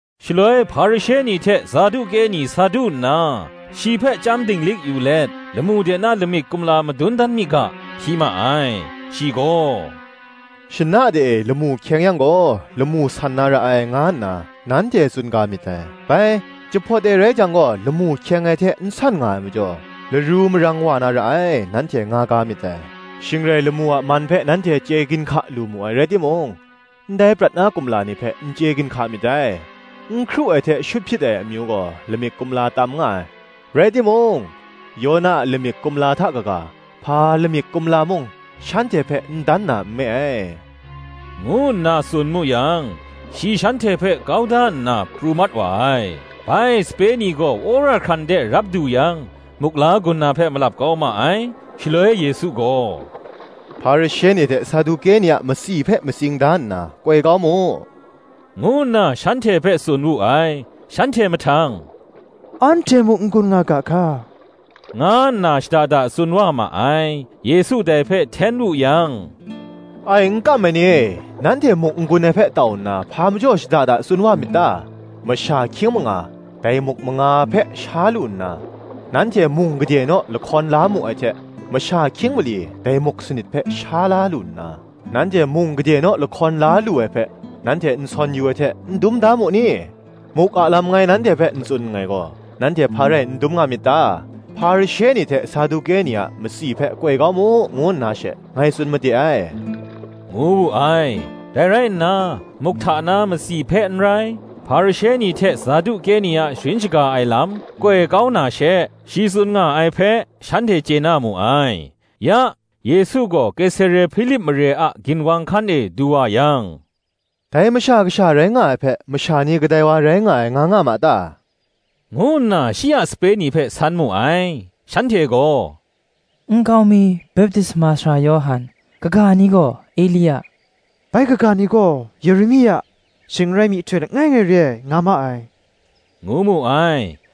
Shaloi Hparishe ni hte Saduke ni sa du nna, shi hpe chyam dinglik yu let, lamu de na lamik kumla madun dan mi ga, hpyi ma ai. Shi gaw, “[Shana de e, lamu hkyeng yang gaw, Lamu san na ra ai, nga nna nanhte tsun ga myit dai: bai, jahpawt e rai jang gaw, lamu hkyeng ai hte n san nga ai majaw, Laru marang wa na ra ai, nanhte nga ga myit dai. Shing rai, lamu a man hpe nanhte chye ginhka lu mu ai rai timung ndai prat na kumla ni hpe, n chye ginhka myit dai.] N hkru ai hte shut hpyit ai amyu gaw, lamik kumla tam nga ai; rai timung, Yona a lamik kumla hta kaga, hpa lamik kumla mung, shanhte hpe n dan na nme ai,” ngu nna tsun mu yang, shi shanhte hpe kau da nna, pru mat wa ai. Bai sape ni gaw wora hkran de rap du yang, muk la gun na hpe malap kau ma ai. Shaloi Yesu gaw, “Hparishe ni hte Saduke ni a matsi hpe matsing da nna koi kau mu,” ngu nna shanhte hpe tsun wu ai. Shanhte mahtang, “Anhte muk n gun nga ga hka,” nga nna shada da tsun wa ma ai. Yesu dai hpe hten wu yang, “Ai n kam ai ni e, nanhte muk n gun ai hpe tau nna, hpa majaw shada da tsun wa myit ta? Masha hkying manga, dai muk manga hpe sha lu nna, nanhte mung gade naw lahkawn la mu ai hte, masha hkying mali, dai muk sanit hpe sha la lu nna, nanhte mung gade naw lahkawn la lu ai hpe, nanhte n sawn yu ai hte, n dum da mu ai? Muk a lam ngai nanhte hpe n tsun nngai gaw, nanhte hpa rai n dum nga myit ta? Hparishe ni hte Saduke ni a matsi hpe koi kau mu, ngu nna she ngai tsun made ai,” ngu wu ai. Dai rai nna, muk hta na matsi hpe n rai, Hparishe ni hte Saduke ni a sharin shaga ai lam koi kau na she, shi tsun nga ai hpe, shanhte chye na mu ai. Ya, Yesu gaw Kesare-Hpilip mare a ginwang hkan e du wa yang, “Dai Masha Kasha rai nga ai hpe, masha ni kadai wa rai nga ai, nga nga ma ta?” ngu nna shi a sape ni hpe san mu ai. Shanhte gaw, “Nkau mi, Baptisma Sara Yawhan; kaga ni gaw, Elia; bai kaga ni gaw, Yeremia, shing n rai myihtoi langai ngai re ai, nga ma ai,” ngu mu ai.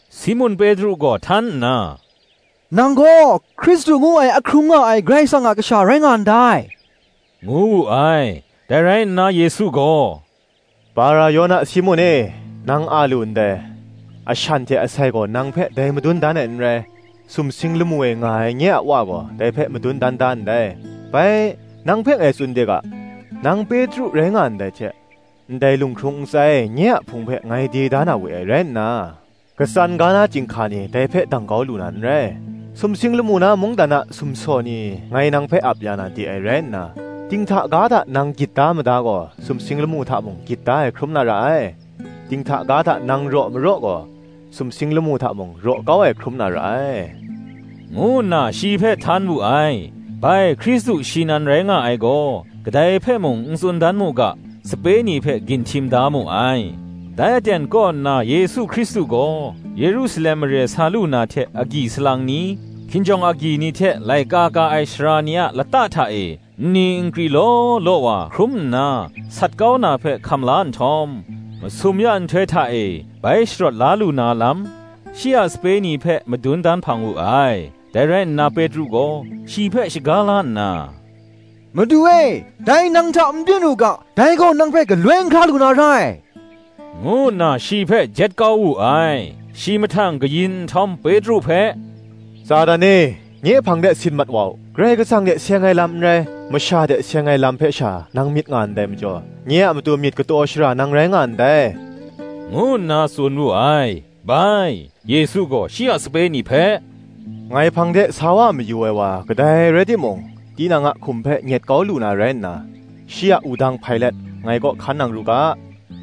Simun Petru gaw htan nna, “Nang gaw Hkristu ngu ai ahkrung nga ai Karai Kasang a Kasha rai nga ndai,” ngu wu ai. Dai rai nna Yesu gaw, “Bara-Yona Simun e, nang a lu ndai: ashan hte asai gaw, nang hpe dai madun dan ai n rai; sumsing lamu e nga ai nye a Wa gaw dai hpe madun dan da ndai. Bai, nang hpe ngai tsun de ga, Nang Petru rai nga ndai hte, ndai lunghkrung ntsa e nye a Hpung hpe ngai de da na we ai rai nna. Katsan ga na chyinghka ni, dai hpe dang kau lu na n rai. Sumsing lamu na mungdan a sumsaw ni ngai nang hpe ap ya na de ai rai nna, dinghta ga hta nang gyit da mada gaw, sumsing lamu hta mung gyit da ai hkrum na ra ai; dinghta ga hta nang raw maraw gaw, sumsing lamu hta mung, raw kau ai hkrum na ra ai,” ngu nna shi hpe htan wu ai. Bai, Hkristu shi rai nga ai gaw, kadai hpe mung n tsun dan mu ga, sape ni hpe ginhtim da mu ai. Dai aten kaw nna Yesu Hkristu gaw, Yerusalem mare sa lu na hte agyi salang ni, hkinjawng agyi ni hte laika ka ai sara ni a lata hta e nni nkri law law wa hkrum nna, sat kau na hpe hkam la nhtawm, masum ya nhtoi hta e, bai sharawt la lu na lam, shi a sape ni hpe madun dan hpang wu ai. Dai rai nna Petru gaw, shi hpe shaga la nna, “Madu e, dai nang hta n byin u ga; dai gaw nang hpe galoi n hkra lu na rai,” ngu nna shi hpe jet kau wu ai. Shi mahtang kayin nhtawm Petru hpe, “Satan e, nye hpang de sit mat wa u; Karai Kasang hte seng ai lam n rai, masha hte seng ai lam hpe sha nang myit nga ndai majaw, nye a matu myit kataw shara nang rai nga ndai,” ngu nna tsun wu ai. Bai, Yesu gaw shi a sape ni hpe, “Ngai hpang de sa wa mayu ai wa kadai rai timung, tinang a hkum hpe nyet kau lu na rai nna, shi a wudang hpai let, ngai kaw hkan nang ru ga.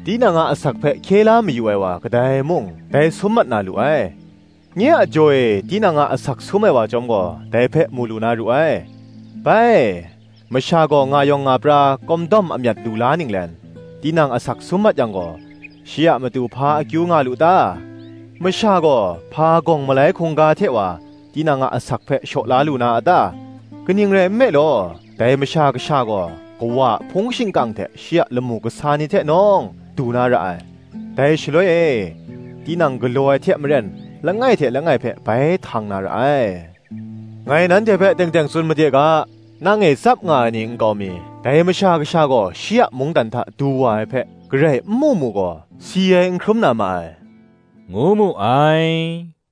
Tinang a asak hpe hkye la mayu ai wa kadai mung, dai sum mat na lu ai; nye a jaw e tinang a asak sum ai wa chyawm gaw, dai hpe mu lu na ru ai. Bai, masha gaw nga yawng nga pra kawm dawm amyat lu la ninglen, tinang asak sum mat yang gaw, shi a matu hpa akyu nga lu ta? masha gaw, hpa gawng malai hkungga hte wa tinang a asak hpe shaw la lu na a ta? Kaning rai nme law, dai Masha Kasha gaw Kawa a hpung shingkang hte shi a lamu kasa ni hte nawng, du na ra ai; dai shaloi e, tinang galaw ai hte maren langai hte langai hpe bai htang na ra ai. Ngai nang hpe teng teng tsun made ga, nang e tsap nga ai ni nkau mi, dai Masha Kasha gaw shi a mungdan hta du wa ai hpe, garai n mu mu gaw, si ai n hkrum na ma ai,” ngu mu ai.